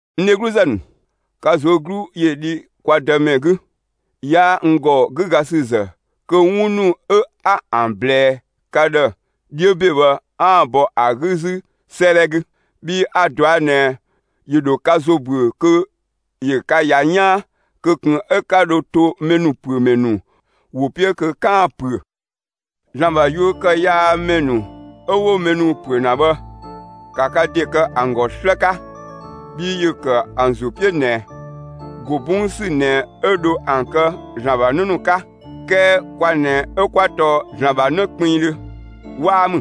N dhegluzë ‑nu, ka ꞊zuö' 'glu ‑yö dhi kwa Dëmɛ 'gü! 'Yaa n ‑gɔ 'gügasüzë kö 'wun ‑nu 'ö 'a ‑an ꞊blɛɛ ka ‑dhë 'dhiö ‑be bhë, 'aan‑ bɔ ‑a 'gü 'zü 'sëëdhɛ 'gü, bhii a‑ ꞊dɔa' ꞊nɛ ‑yö ‑dho ka ‑zo ‑büö kö ‑yö ka ‑ya 'yaan, kö ꞊kun 'ö 'ka dho to mɛ ‑nu ‑püö ‑mɛ ‑nu ‑wo 'piö kö 'kaan‑ ‑püö. ‑Zlan ‑bha yuö ‑kë yaa ‑mɛ ‑nu 'ö 'wo mɛ ‑nu ‑püö ‑na bhë, ‑ka ka ‑de kë ‑an ‑gɔ 'slë 'ka! Bhii ‑yö ‑kë ‑an ‑zo 'piö ꞊nɛ, ‑go 'bɔng ‑sü ꞊nɛ 'ö dho ‑an kë ‑Zlan ‑bha 'në ‑nu 'ka. 'Kɛɛ kwa ꞊nɛ 'ö 'kwa tɔɔ ‑Zlan ‑bha 'në kpinngdhö, 'waa ‑mü?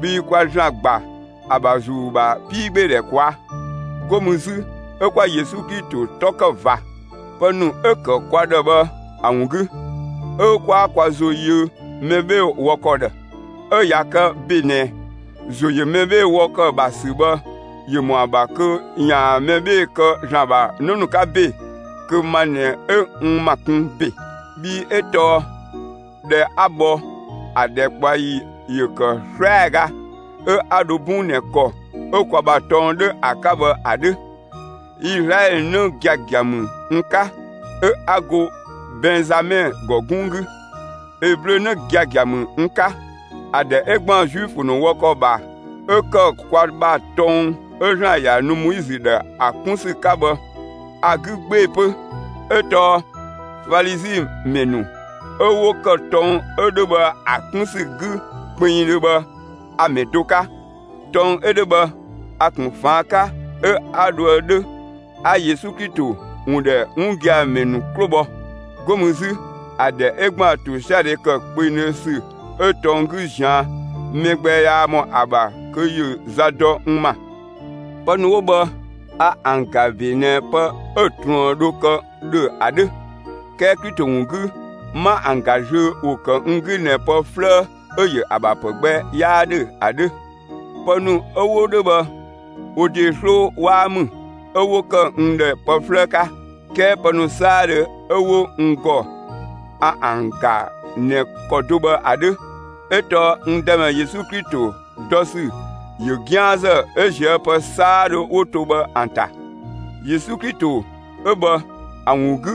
Bhii kwa ‑Zlan ‑gba ‑a ‑bha ‑Zuu ‑bha 'piigbeedhɛ ꞊kwaa'. 'Go mü 'zü 'ö 'kwa Yesu Klito 'tɔ ‑kë ꞊va, pë ‑nu 'ö‑ ‑kë kwa ‑dhë bhë ‑a ‑wun 'gü; 'ö 'kwaa kwa ‑zo yö mɛ 'bhee‑ wɔ ‑kɔ ‑dhë. 'Ö ꞊ya kë ‑be ꞊nɛ, ‑zo ‑yö mɛ 'bhee‑ wɔ ‑kɔ ‑bha ‑sü bhë ‑yö ‑mɔ ‑a ‑bha kö ‑yaan mɛ 'bhee‑ kë ‑Zlan ‑bha 'në 'ka ‑be, kö ma ꞊nɛ 'ö n ‑ma kun ‑be. Bhii 'ö tɔɔ ꞊dhɛ 'a bhɔ, ‑a ‑dhɛkpaɔyi ‑yö ‑kë 'slɛaga, 'ö 'a dho 'bɔn ꞊nɛ ‑kɔ 'ö kwa ‑bha tɔng 'dhö ‑a 'ka bhë ‑a 'dhö. Izlaɛlö 'në giagia ‑mü n 'ka, 'ö 'a go Bɛnzamɛ ‑gɔ 'gunng 'gü. Eblö 'në giagia ‑mü n 'ka. ‑A ‑dhɛ 'ö ‑gban Zuifö ‑nu wɔ ‑kɔ ‑bha 'ö ‑kë kwa ‑bha tɔng 'ö ‑Zlan ‑ya nu Moizö ‑dhë ‑a 'kun ‑sü 'ka bhë, a‑ 'gü 'gbee‑ 'pö, 'ö tɔɔ Falizi ‑mɛ ‑nu, 'ö 'wo ‑kë tɔng 'ö 'dhö bhë ‑a 'kun ‑sü 'gü kpinngdhö bhë, ‑a mɛ do 'ka. Tɔng 'ö 'dhö bhë, a‑ ‑kun ꞊faan' 'ka, 'ö 'a dhoë 'dhö, 'a Yesu Klito ‑wun ‑dhɛ 'wun gia‑ ‑mɛ ‑nu 'klo bhɔ. 'Go mü 'zü, ‑a ‑dhɛ 'ö ‑gban ‑tosiadhe ‑kë kpengdhö ‑sü 'ö tɔng 'gü ꞊zian', mɛ gbɛ 'yaa ‑mɔ ‑a ‑bha kö ‑yö za dɔ n ‑ma. Pë ‑nu 'wo bhë, a ‑an ‑ga ‑be ꞊nɛ pë 'ö‑ ꞊truën dho ‑kë ‑dhö ‑a 'dhö, 'kɛɛ Klito ‑wun 'gü, 'ma ‑an ‑ga zlöö, ‑wo ‑kë n 'gü ꞊nɛ pë 'flëë 'ö‑ ‑yö ‑a ‑bha ‑pë gbɛ 'yaa 'dhö ‑a 'dhö. Pë ‑nu 'ö 'wo 'dhö bhë, wo ‑de 'sloo 'waa ‑mü 'ö 'wo ‑kë n ‑dhë pë 'flëë 'ka; 'kɛɛ pë ‑nu 'saadhö 'ö 'wo n ‑gɔ a ‑an ‑ga ꞊nɛ ‑kɔ do bhë ‑a 'dhö, 'ö tɔɔ n Dëmɛ Yesu Klito dɔ ‑sü ‑yö 'gianzë 'ö ꞊zië' pë 'saadhö 'wo to bhë ‑an ‑ta. Yesu Klito 'ö bhë ‑a ‑wun 'gü,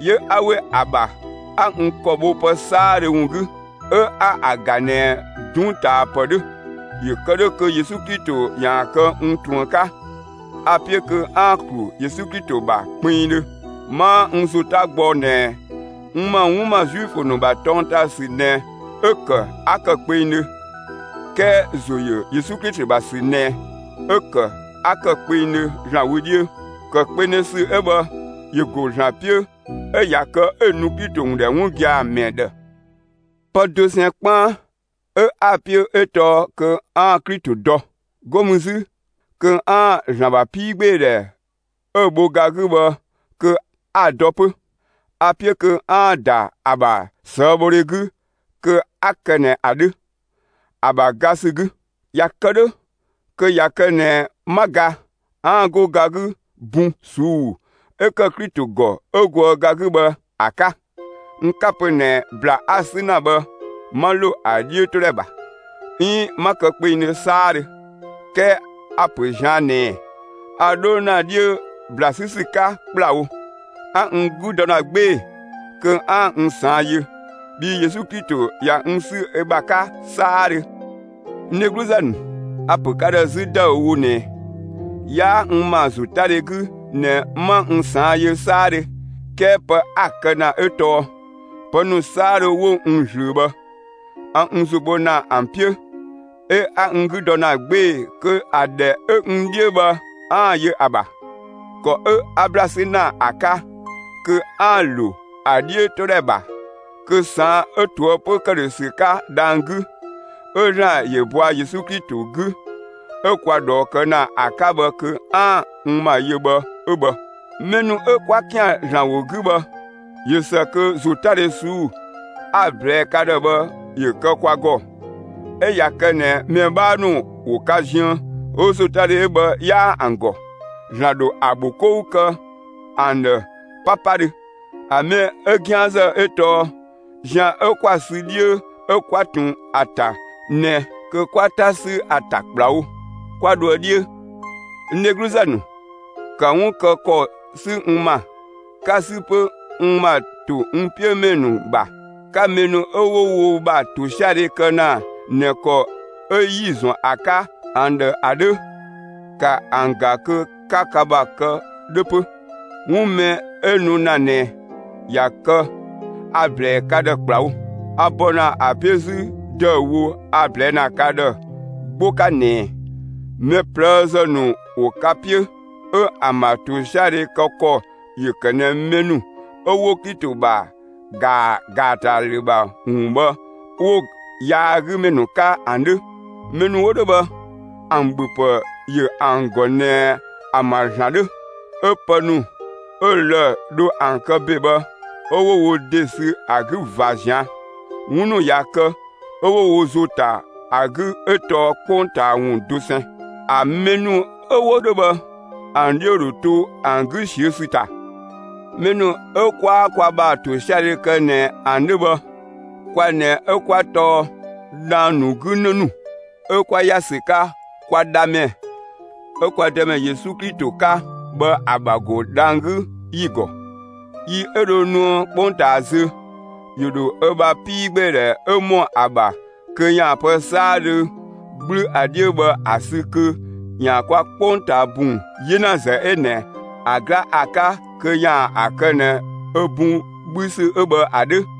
'yö 'a ‑we ‑a ‑bha 'a n ‑kɔ bho pë 'saadhö ‑wun 'gü, 'ö 'a ‑an ‑ga ꞊nɛ 'dunngtaapë 'dhö, ‑yö kë 'dhö kö Yesu Klito ‑yaan kë n ꞊truën 'ka. A‑ 'piö kö 'aan‑ ‑klu Yesu Klito ‑bha kpinngdhö. 'Maa n ‑zo 'ta gbɔ ꞊nɛ n ‑ma 'wun ‑ma Zuifö ‑nu ‑bha tɔng ‑ta ‑sü ꞊nɛ 'ö‑ ‑kë 'a ‑kë kpengdhö, 'kɛɛ ‑zo ‑yö Klito ‑bha ‑sü ꞊nɛ 'ö‑ ‑kë 'ö 'a ‑kë kpengdhö ‑Zlan wö 'dhiö. ‑Kë kpengdhö ‑sü 'ö bhë ‑yö ‑go ‑Zlan 'piö 'ö ꞊ya kë 'ö‑ nu Klito ‑wun ‑dhɛ 'wun gia‑ ‑mɛ ‑dhë. Pë dosɛn 'kpaan 'ö 'a‑ 'piö 'ö tɔɔ kö 'aan‑ Klito dɔ. 'Go mü 'zü kö 'aan‑ ‑Zlan ‑bha 'piigbeedhɛ 'ö‑ bho ga 'gü bhë kö 'a‑ dɔ 'pö. A‑ 'piö kö 'aan‑ ‑da ‑a ‑bha ꞊sëëbhodhe 'gü kö 'a kë ꞊nɛ ‑a 'dhö, ‑a ‑bha ga ‑sü 'gü. ꞊Ya kë 'dhö, kö ꞊ya kë ꞊nɛ 'ma ga, 'aan‑ go ga 'gü bun ꞊suu'‑ 'ö ‑kë Klito ‑gɔ 'ö goë ga 'gü bhë ‑a 'ka. N 'ka‑ pö ꞊nɛ ‑bla 'a‑ 'sü ‑na bhë 'ma ‑lo ‑a 'dhiötodhɛ ‑bha, 'iin 'ma kë kpengdhö 'saadhö; 'kɛɛ a‑ ‑pö ꞊zian' ꞊nɛɛ, a 'dho ‑na 'dhiö ‑bla 'sü ‑sü 'ka ‑kplawo; 'a n 'gü dɔ ‑na 'gbee‑ kö 'aan‑ n ꞊saan' yö, bhii Yesu Klito ꞊ya n 'sü ö ‑bha 'ka 'saadhö. N dhegluzë ‑nu, a‑ ‑pö ka ‑dhë 'zü ‑dëüwo ꞊nɛ, 'yaa n ma ‑zotadhe 'gü ꞊nɛ 'ma n ꞊saan' yö 'saadhö 'kɛɛ pë 'a‑ kë ‑na 'ö tɔɔ: Pë ‑nu 'saadhö 'wo n ꞊zlöö bhë, a n ‑zo bho ‑na ‑an 'piö, 'ö 'a n 'gü dɔ ‑na 'gbee‑ kö ‑a ‑dhɛ 'ö n 'dhiö bhë 'aan‑ yö ‑a ‑bha. ‑Kɔ 'ö 'a ‑bla 'sü ‑na ‑a 'ka kö 'aan‑ ‑lo ‑a 'dhiötodhɛ ‑bha kö ꞊saan' 'ö ꞊toëpö ‑këdhösü 'ka dhang‑ 'gü, 'ö ‑Zlan ‑yö bɔa Yesu Klito 'gü 'ö kwa ꞊dhɔɔ kë ‑na ‑a 'ka bhë kö 'aan‑ n ‑ma yö bhë 'ö bhë. Mɛ ‑nu 'ö 'kwa ‑kian ‑Zlan ‑wo 'gü bhë, ꞊yö ‑së kö ‑zotadhe ꞊suu'‑ 'a‑ ꞊blɛɛ ka ‑dhë bhë ‑yö kë kwa ‑gɔ. 'Ö ꞊ya kë ꞊nɛ mɛ 'bhaa ‑nu ‑wo ka ziën 'ö ‑zotadhe 'ö bhë 'yaa ‑an ‑gɔ, ‑Zlan ‑dho ‑a ‑bho 'kou kë ‑an ‑dhë 'papadhö. ‑A mɛ 'ö 'gianzë 'ö tɔɔ zian 'ö 'kwa‑ sü 'dhiö 'ö 'kwa ꞊tun ‑a ‑ta ꞊nɛ kö 'kwa 'ta 'sü ‑a ‑ta ‑kplawo, 'kwa dhoë 'dhiö. N dhegluzë ‑nu, ‑ka 'wun kë ‑kɔ 'sü n ‑ma, 'ka‑ 'sü 'pö n ‑ma ‑to n 'piö ‑mɛ ‑nu ‑bha! 'Ka mɛ ‑nu 'ö 'wo wo ‑bha ‑tosiadhe kë ‑na ꞊nɛ ‑kɔ 'ö 'yi‑ ‑zɔn ‑a 'ka ‑an ‑dhë ‑a 'dhö, ‑ka ‑an ‑ga kö 'ka ka ‑bha kë 'dhö 'pö! 'Wun mɛ 'ö nu ‑na ꞊nɛ ꞊ya kë a‑ ‑blɛɛ ka ‑dhë ‑kplawo. A bɔ ‑na ‑a 'piö 'zü ‑dëüwo 'a‑ ꞊blɛɛ' ‑na ka ‑dhë 'gbo 'ka ꞊nɛ: Mɛ ꞊plëëzë ‑nu ‑wo ka 'piö, 'ö ‑an ‑bha ‑tosiadhe kë ‑kɔ ‑yö ‑kë ꞊nɛ mɛ ‑nu 'ö 'wo Klito ‑bha ‑ga ‑gaatalü ‑bha ‑wun bhë 'wo‑ yaagümɛ ‑nu 'ka ‑an 'dhö. Mɛ ‑nu 'wo 'dhö bhë, ‑an ‑bhöpë ‑yö ‑an ‑gɔ ꞊nɛ ‑an ‑bha ‑zlan 'dhö. 'Ö pë ‑nu 'ö‑ lë‑ dho ‑an kë ‑be bhë, 'ö 'wo wo ‑de sü ‑a 'gü ꞊va ꞊zian'. 'Wun ‑nu ꞊ya kë 'ö 'wo wo ‑zo ‑ta ‑a 'gü 'ö tɔɔ 'kpongtaa ‑wun dosɛn. ‑A mɛ ‑nu 'ö 'wo 'dhö bhë, ‑an 'dhiö ‑dho to ‑an 'gü ꞊siö' ‑sü ‑ta. Mɛ ‑nu 'ö 'kwaa kwa ‑bha ‑tosiadhe kë ꞊nɛ ‑an 'dhö bhë, kwa ꞊nɛ 'ö 'kwa tɔɔ dhang‑ ‑nu 'gü 'në ‑nu, 'ö 'kwa ‑ya ‑sü 'ka kwa Dhamɛ 'ö kwa Dëmɛ Yesu Klito 'ka bhë ‑a ‑bha ‑go dhang‑ 'gü ‑yi ‑gɔ. Yi 'ö dho nuë 'kpongtaa zö, ‑yö ‑dho ö bha 'piigbeedhɛ 'ö ‑mɔ ‑a ‑bha kö ‑yaan pë 'saadhö 'gblü ‑a 'dhiö bhë ‑a sü kö ‑yaan kwa 'kpongtaa ‑bun 'yenazë 'ö ꞊nɛ ‑a 'gla ‑a 'ka kö ‑yaan ‑a kë ꞊nɛ ö bun 'bhü ‑sü 'ö bhë ‑a 'dhö.